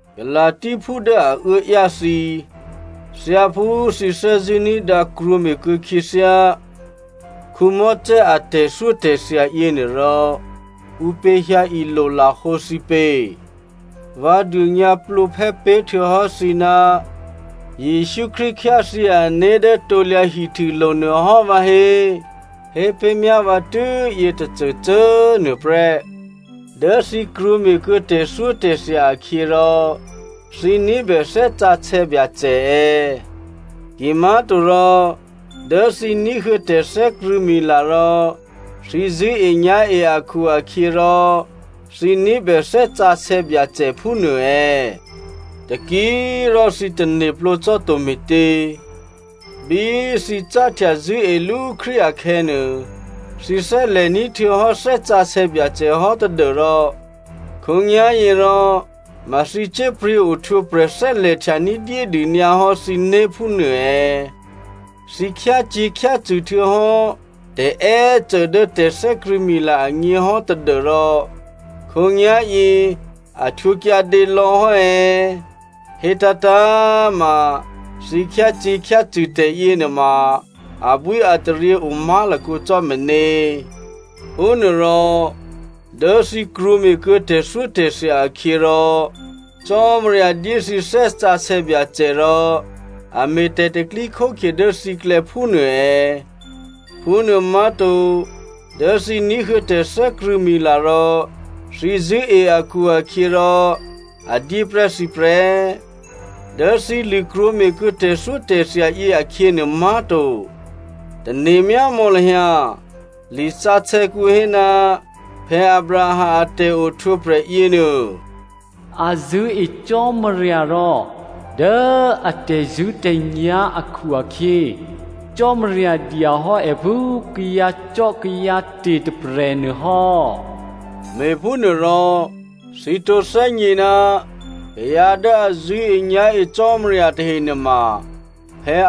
Galasiaphú dố a uốáyá thǐ꤮ thyáphú thǐ thè́zṳ̂́ ní̤dǎ krwǒme̤kuô̌ khyěthyá Mosè a tè̤thyótè̤thya yěnuô rò ǔpě hyǎ ilolahǒ thǐ pě? Vǎ dônyǎplǒphè́ pé̤htuô̌hò́ thǐ ná Jesǔ Krístu khyáthyě ané̤ dố krusulo̤ nuôhò́ vǎhé꤮. Hé pé̤myá vǎ tû́ yětôcôcô꤮ nuôprè́. Dố thǐ krwǒme̤kuô̌ tè̤thyótè̤thya akhyě rò thǐ ní̤bè Thè́ Sǎsè̌ Byacè è̌? Kimá̤torò dố thǐ ní̤huô̌ tè̤thè́krṳ̂̌mila rò thǐ zṳ̂́enyá̤e akhu-akhyěrò, thǐ ní̤bè Thè́ Sǎsè̌ Byacè phúnuô è̌? Taki꤮ rò thǐ tane̤plǒ cò́ to me̤tě? Bí thǐ cáhtya zṳ̂́elú Krístu akhè̌nuô, thǐ thè́lè̤ní̤ htuô̌hò́ Thè́ Sǎsè̌ Byacè hò́ tadû́rò khǒnyá̤yěrò ma thǐ cyé̤pryě̤ ohtwǒprè̤ thè́lè̤htya ní̤dyédû nyǎhò́ thǐné̤ phúnuô è̌? Thǐ khyácyě̤khyácṳ̂ htuô̌hò́ tè̤è́cô dố tè̤thè́krṳ̂̌mila agně hò́ tadû́rò khǒnyá̤yě a htwǒ kyǎdě lò̌ hò́ è̌? Hétǎ̤tǎ̤꤮ ma thǐ khyácyě̤khyácṳ̂ tè̤yě nuôma abwíataryě o má̤lakǒ cò́ meně. Phúnuôrò dố thǐ krwǒme̤kuô̌ tè̤thyótè̤thya akhyě rò Cò́marya dyé thǐ Thè́ Sǎsè̌ Byacè rò a me̤ tè̤pro̤tè̤prya̤ dố thǐklè̌ phúnuô è̌? Phúnuô má̤to. Dố thǐ ní̤huô̌ tè̤thè́krṳ̂̌mila rò thǐ zṳ̂́e akhu-akhyěrò a dyé prè́ thǐ prè́. Dố thǐ lṳ̂krwǒme̤ kuô̌ tè̤thyótè̤thya yě akhyě nuô má̤to. Tane̤myámò̌ lahyǎ, lisǎsè̌kǔ hé, Abraham a tè̤ohtwǒprè̤ yěnuô, “A zṳ̂́e Cò́marya rò dố a tè̤zṳ̂́tè̤nyá̤ akhu-akhyě, Cò́marya dya hò́ è phú kayǎcò́kayǎte̤ tôprè̤ nuôhò́.” Me̤phúnuôrò thǐ tǒ thè́gně ná kayǎ dố a zṳ̂́enyá̤e Cò́marya tahe nuôma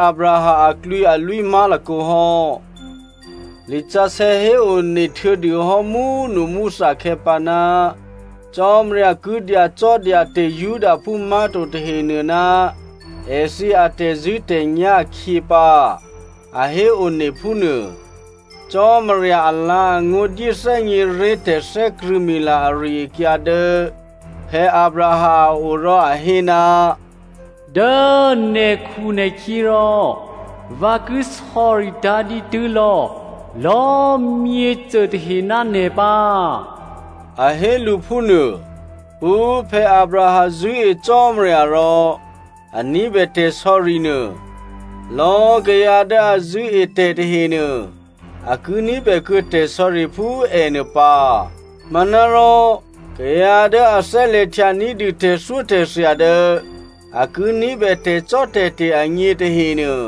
Abraham aklwǐalwí má̤lakǒ hò́. Lisǎsè̌ héone htuô̌dû hò́ múnumúthakhè̌ pǎ, Cò́marya ki dyacò́dyate̤ Judaphú má̤to tahenuô ná èthǐ atè̤zṳ̂́tè̤nyá̤ akhyě pǎ, a héone phúnuô. Cò́marya alǎ̤angó̤ dyé thè́gněré̤ tè̤thè́krṳ̂̌mila ari-akyǎ dố Abraham a o rò a hé, “Dố nè̤khunè̤khyě rò, vǎ ki sò̌ritǎ̤ dǐtû́ lò̌lò̌꤮ myěcô tahe ná nè̤ pǎ,” a hé lǔ phúnuô. Phú Abraham zṳ̂́e Cò́marya rò a ní̤bè tè̤sò̌ri nuô, lò̌꤮ kayǎ dố a zṳ̂́e tè̤ tahenuô a ki ní̤bè kuô̌ tè̤sò̌ri phú è nuô pǎ. Manárò kayǎ dố a thè́lè̤htya ní̤dû tè̤thyótè̤thya dố a ki ní̤bè tè̤cò́tè̤te̤ agně tahenuô,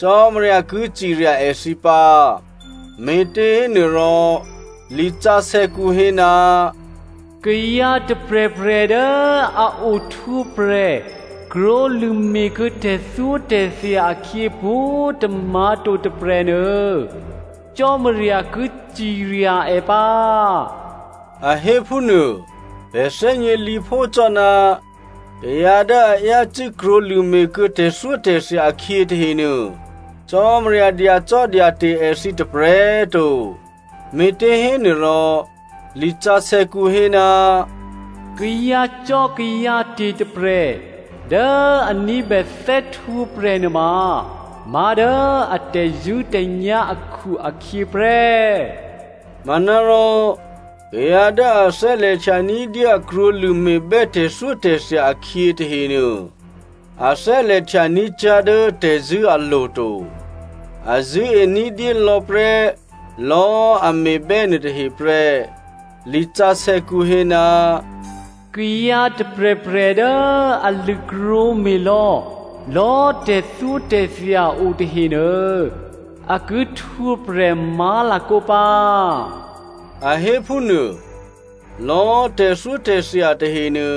Cò́marya ki cirya èthǐ pǎ. Me̤těhénuôrò lisǎsè̌kǔ hé, “Kayǎ tôprè̤prè̤ dố a ohtwǒprè̤ krwǒlṳ̂me̤ kuô̌ tè̤thyótè̤thya akhyě pwǒ̤tômǎ̤ to tôprè̤nuô, Cò́marya ki cirya è pǎ,” a hé phúnuô. Pè̤ thè́gně lǐphó cò́ ná kayǎ dố a yácû́ krwǒlṳ̂me̤ kuô̌ tè̤thyótè̤thya akhyě tahenuô, Cò́marya dyacò́dyate̤ èthǐ tôprè̤꤮ to. Me̤těhénuôrò lisǎsè̌kǔ hé, “Kayǎcò́kayǎte̤ tôprè̤ dố a ní̤bè thè́htwǒprè̤ nuôma má̤dố a tè̤zṳ̂́tè̤nyá̤ akhu-akhyě prè́.” Manárò kayǎ dố a thè́lè̤htya ní̤dyé a krwǒlṳ̂ me̤bè́ tè̤thyótè̤thya akhyě tahenuô, a thè́lè̤htya ní̤cyá̤ dố tè̤zṳ̂́ alo̤ to. A zṳ̂́e ní̤dyélò̌ prè́ lò̌꤮ a me̤bè́ nuôtahe prè́. Lisǎsè̌kǔ hé, “Kayǎ tôprè̤prè̤ dố a lṳ̂krwǒme̤ lò̌lò̌꤮ tè̤thyótè̤thya o tahenuô, a ki htwǒprè̤ má̤lakǒ pǎ,” a hé phúnuô. Lò̌꤮ tè̤thyótè̤thya tahenuô,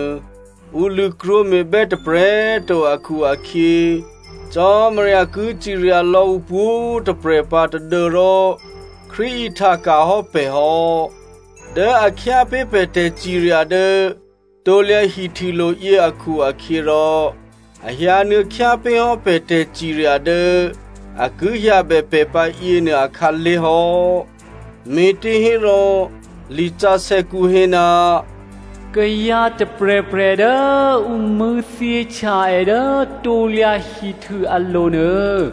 ǔ lṳ̂krwǒ me̤bè́ tôprè̤꤮ to akhu-akhyě, Cò́marya ki cirya lò̌ ǔpwǒ̤꤮ tôprè̤ pǎ, tadû́rò Krístu ihtaka̤ hò́ pè̤ hò́. Dố a khyápé̤ pè̤ tè̤cirya dố krusulo̤ yě akhu-akhyěrò a hyǎnuô̌ khyápé̤hò́ pè̤ tè̤cirya dố a ki hyǎbè pè̤ pǎ yěnuô akhǎlé̤ hò́. Me̤těhérò lisǎsè̌kǔ hé, “Kayǎ tôprè̤prè̤ dố ǔ mṳ̂̌thyěhtya è dố krusu alo̤ nuô,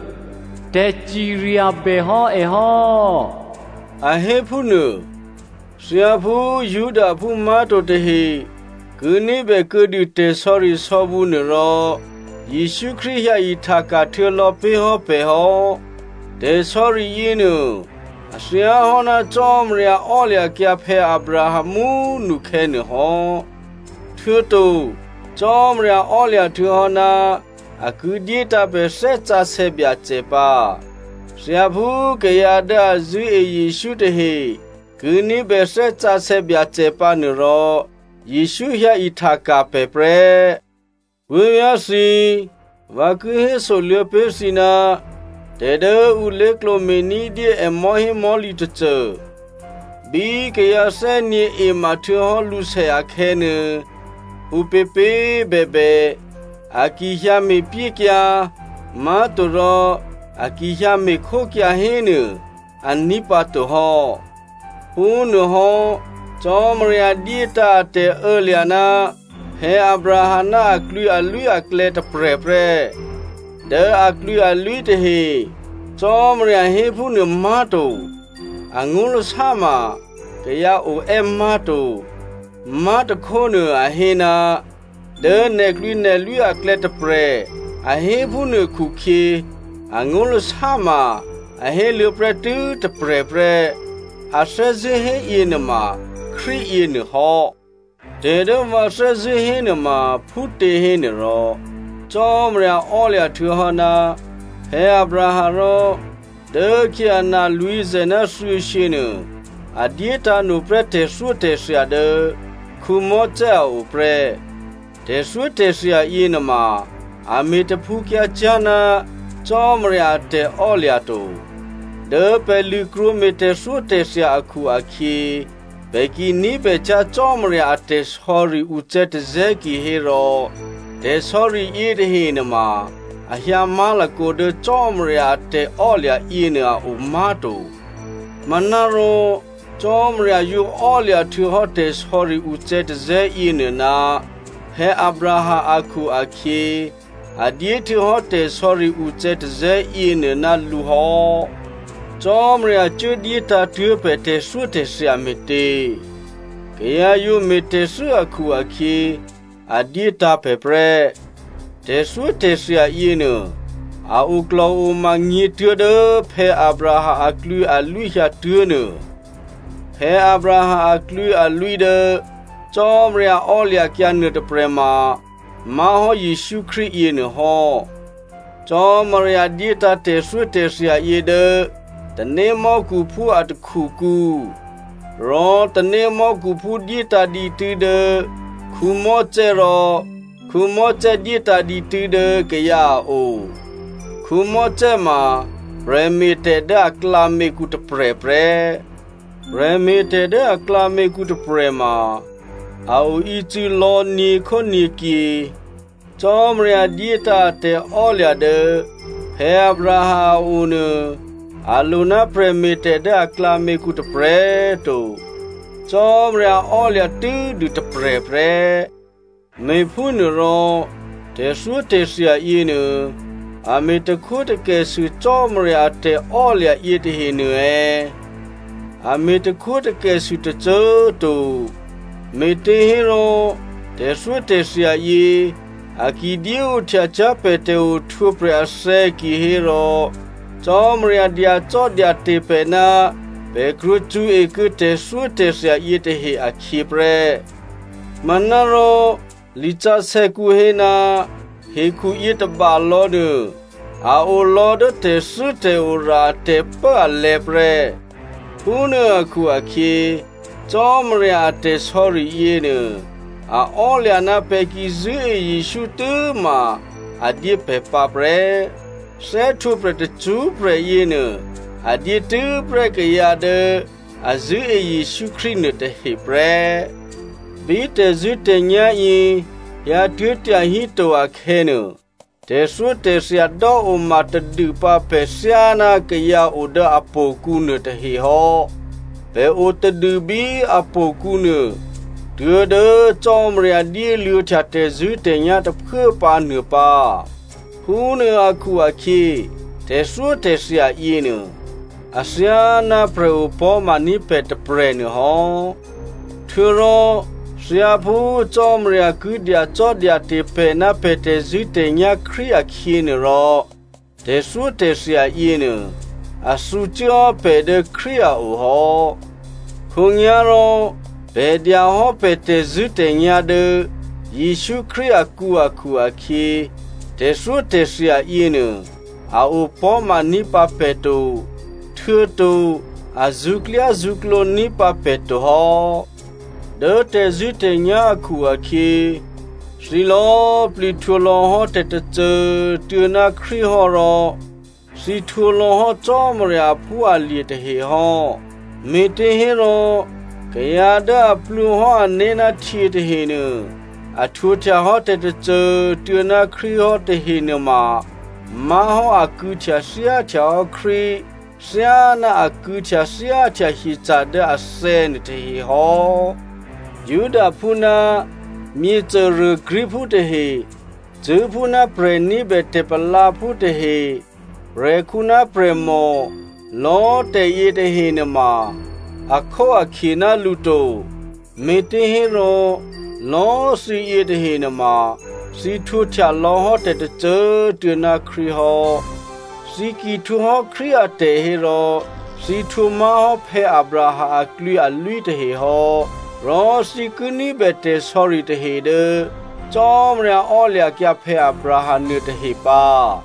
tè̤cirya bèhò́ è hò́,” a hé phúnuô. Thyáphú Judaphú má̤to tahe ki ní̤bè kuô̌dû tè̤sò̌risò̌bǔ nuôrò, Jesǔ Krístu hyǎihtaka̤ htuô̌ lò̌ pé̤ hò́ pè̤ hò́. Tè̤sò̌ri yěnuô, a thyáhò́ ná Cò́marya ò́lya̤kyǎ Abraham mú꤮ nukhè̌ nuô hò́. Htuô̌to Cò́marya ò́lya̤ htuô̌hò́ ná a ki dyétǎ̤ pè̤ Thè́ Sǎsè̌ Byacè pǎ. Thyáphú kayǎ dố a zṳ̂́e Jesǔ tahe ki ní̤bè Thè́ Sǎsè̌ Byacè pǎnuôrò, Jesǔ hyǎ ihtaka̤ pè̤ prè́. Puố̤vyá̤ thǐ꤮, vǎ ki hésoluô̌ pé̤ thǐ ná tè̤ dố ǔ lé̤klǒ me̤ ní̤dyé è mò̤́hémò̤́lǐ tôcô. Bí kayǎ thè́nyě̤ ema htuô̌hò́ lǔsè akhè̌nuô, ǔpěpě꤮ bèbè, a ki hyǎ me̤pyékyǎ má̤torò a ki hyǎ me̤khókyǎ hénuô, aní̤ pǎ to hò́. Phúnuôhò́ Cò́marya dyétǎ̤ a tè̤ô̌lya̤ ná Abraham ná aklwǐalwí aklè̌ tôprè̤ prè́. “Dố aklwǐalwí tahe,” Cò́marya hé phúnuô má̤to. Angó̤lasá ma kayǎ o è́ má̤to. Má̤tôkhónuô, a hé, “Dố nè̤klwǐnè̤lwí aklè̌tôprè̤,” a hé phúnuô khukhyě angó̤lasá ma a héluô̌ prè́ tû́ tôprè̤ prè́. A thè́zṳ̂́ hé yěnuôma Krístu yěnuô hò́. Tè̤dố vǎ thè́zṳ̂́ hénuôma phútě hénuôrò, Cò́marya ò́lya̤ htuô̌hò́ ná Abraham rò dốkhyě ana lwǐ̤zè̤ ná thuô̌shyě nuô a dyétǎ̤no prè́ tè̤thyótè̤thya dố Mosè a o prè́. Tè̤thyótè̤thya yěnuôma, a me̤ taphǔkyǎcyá̤ ná Cò́marya a tè̤ò́lya̤ to. Dố pè̤ lṳ̂krwǒ me̤ tè̤thyótè̤thya akhu-akhyě, pè̤ ki ní̤bècyá̤ Cò́marya a tè̤sò̌ri ucè̌tazè̌ kihérò tè̤sò̌ri yětahe nuôma a hyǎ má̤lakǒ dố Cò́marya a tè̤ò́lya̤ yěnuô a o má̤to. Manárò Cò́marya yǒ ò́lya̤ htuô̌hò́ tè̤sò̌ri ucè̌tazè̌ yěnuô ná Abraham akhu-akhyě, a dyé htuô̌hò́ tè̤sò̌ri ucè̌tazè̌ yěnuô ná lǔ hò́. Cò́marya cuốdyétǎ̤ tuố̤ pè̤ tè̤thyótè̤thya me̤tě? Kayǎ yǒ me̤tè̤thû́ akhu-akhyě, a dyétǎ̤ pè̤ prè́. Tè̤thyótè̤thya yěnuô, a oklò̤oma gně tuố̤dố Abraham aklwǐalwí hyǎtuố̤nuô. Abraham aklwǐalwí dố Cò́marya ò́lya̤kyǎ nuôtôprè̤ ma má̤hò́ Jesǔ Krístu yěnuôhò́. Cò́marya dyétǎ̤ tè̤thyótè̤thya yě dố tanémò́khuphú a takhukǔ. Rò tanémò́khuphú dyétǎ̤ dǐtû́ dố Mosè rò Mosè dyétǎ̤ dǐtû́ dố kayǎ a o. Mosè ma prè̤me̤tè̤ dố aklǎměkǔ tôprè̤ prè́. Prè̤me̤tè̤ dố aklǎměkǔ tôprè̤ma a oícû̌ lò̌ nyě̤khónyě̤kyě. Cò́marya dyétǎ̤ a tè̤ò́lya̤ dố Abraham a o nuô, a lo ná prè̤me̤tè̤ dố aklǎměkǔ tôprè̤꤮ to. Cò́marya ò́lya̤ tû́dû tôprè̤ prè́. Me̤phúnuôrò tè̤thyótè̤thya yěnuô a me̤takhwótakè sû Cò́marya a tè̤ò́lya̤ yětahenuô è̌? A me̤takhwótakè sû tôcô꤮ to. Me̤těhérò tè̤thyótè̤thya yě, a ki dyéohtyacyá̤ pè̤ tè̤ohtwǒprè̤ athè̌ kihérò Cò́marya dyacò́dyate̤ pè̤ ná pè̤ krwǒ cṳ̌ekuô̌ tè̤thyótè̤thya yětahe akhyě prè́. Manárò lisǎsè̌kǔ hé, hekhu yětôba lò̌nuô, a o lò̌ dố tè̤thû́tè̤ora a tè̤pốalè̤̌ prè́. Phúnuô akhu-akhyě Cò́marya a tè̤sò̌ri yěnuô a ò́lya̤ ná pè̤ ki zṳ̂́e Jesǔ tû́ma a dyé pè̤ pǎ prè́. Thè́htwǒprè̤ tacṳ́prè̤ yěnuô a dyétû́prè́ kayǎ dố a zṳ̂́e Jesǔ Krístu nuôtahe prè́. Bí tè̤zṳ̂́tè̤nyá̤ yě hyǎtuố̤ tyahíto akhè̌nuô, tè̤thyótè̤thya dò́oma tadûpǎ pè̤ thyáná kayǎ o dố htò̌kǔ nuôtahe hò́. Pè̤ o tadû bí htò̌kǔnuô tuố̤dố Cò́marya dyéluô̌htya tè̤zṳ̂́tè̤nyá̤ tôphuố pǎ nuô pǎ. Phúnuô akhu-akhyě, tè̤thyótè̤thya yěnuô athyáná prè̤ opò̤́maní̤ pè̤ tôprè̤nuô hò́. Htuô̌rò thyáphú Cò́marya ki dyacò́dyate̤ pè̤ ná pè̤ tè̤zṳ̂́tè̤nyá̤ Krístu akhyě nuô rò tè̤thyótè̤thya yěnuô a thǔcuốhò́ pè̤ dố Krístu a o hò́. Khǒnyá̤rò pè̤ dya hò́ pè̤ tè̤zṳ̂́tè̤nyá̤ dố Jesǔ Krístu akǔ akhu-akhyě, tè̤thyótè̤thya yěnuô a opò̤́maní̤ pǎ pè̤ to, htuô̌to a zṳ̌klyázṳ̌klǒ ní̤ pǎ pè̤ to hò́. Dố tè̤zṳ̂́tè̤nyá̤ akhu-akhyě, thǐ lò̌꤮ plǐ htwǒlò̌hò́ tè̤tôcô꤮ tuô̌ ná Krístu hò́ rò thǐ htwǒlò̌hò́ Cò́marya aphúalye̤ tahe hò́. Me̤těhérò kayǎ dố a plwǒhò́ ané̤ ná htyě tahenuô, a htwǒhtyahò́ tè̤tôcô꤮ tuô̌ ná Krístu hò́ tahe nuôma má̤hò́ a kû̌htyathyáhtyahò́ Krístu thyáná a kû̌htyathyáhtya hyeca̤ dố athè̌ nuôtahe hò́. Judaphú ná myěcôruô Greekphú tahe, cṳ̂́phú ná prè̤ ní̤bè tè̤palǎphú tahe, prè̤khǔ ná prè̤mò, lò̌꤮ tè̤ yětahe nuôma akhóakhye ná lǔ to, me̤těhérò lò̌꤮ thǐ yětahe nuôma thǐ htwǒhtya lò̌ hò́ tè̤tôcô꤮ tuô̌ ná Krístu hò́. Thǐ ki htwǒhò́ Krístu atè̤ hérò thǐ htwǒ má̤hò́ Abraham aklwǐalwí tahehò́. Rò thǐ ki ní̤bè tè̤sò̌ri tahe dố Cò́marya ò́lya̤kyǎ Abraham nuôtahe pǎ.